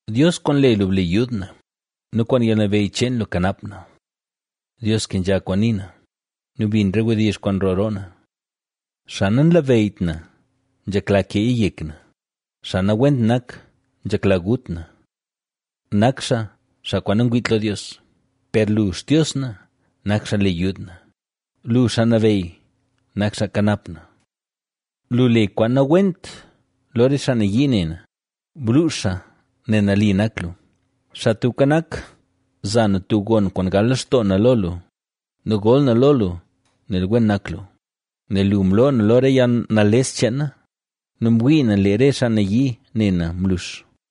Dios, kwaan le lu, ble yud na nu kwaan yalnabeyy cheen lu, kanap na. Dios, kenzha kwaan nii na nu bin re wdizh kwaan nroo roo na. Xaa nanlabeyyt na nzhekla keeya yek na; xaa nawent nak nzhekla gut na. ¡Nak xaa, xaa kwaan nangwiit lo Dios! Per lu, Xtios na, nak xaa le yud na; lu, Xaa Nabeyy, nak xaa nkanap na. Lu le kwaan nawent lo re xaa nayii ne na, ¡bluux xaa nel nali nak lu! Xaa Tubka Nak, za na tub gon kwaan gal lextoo na lo lu nu gol na lo lu, nel wen nak lu; nel lu mloo na lo re yalnales cheen na nu mwii na lee re xaa nayii ne na mlux.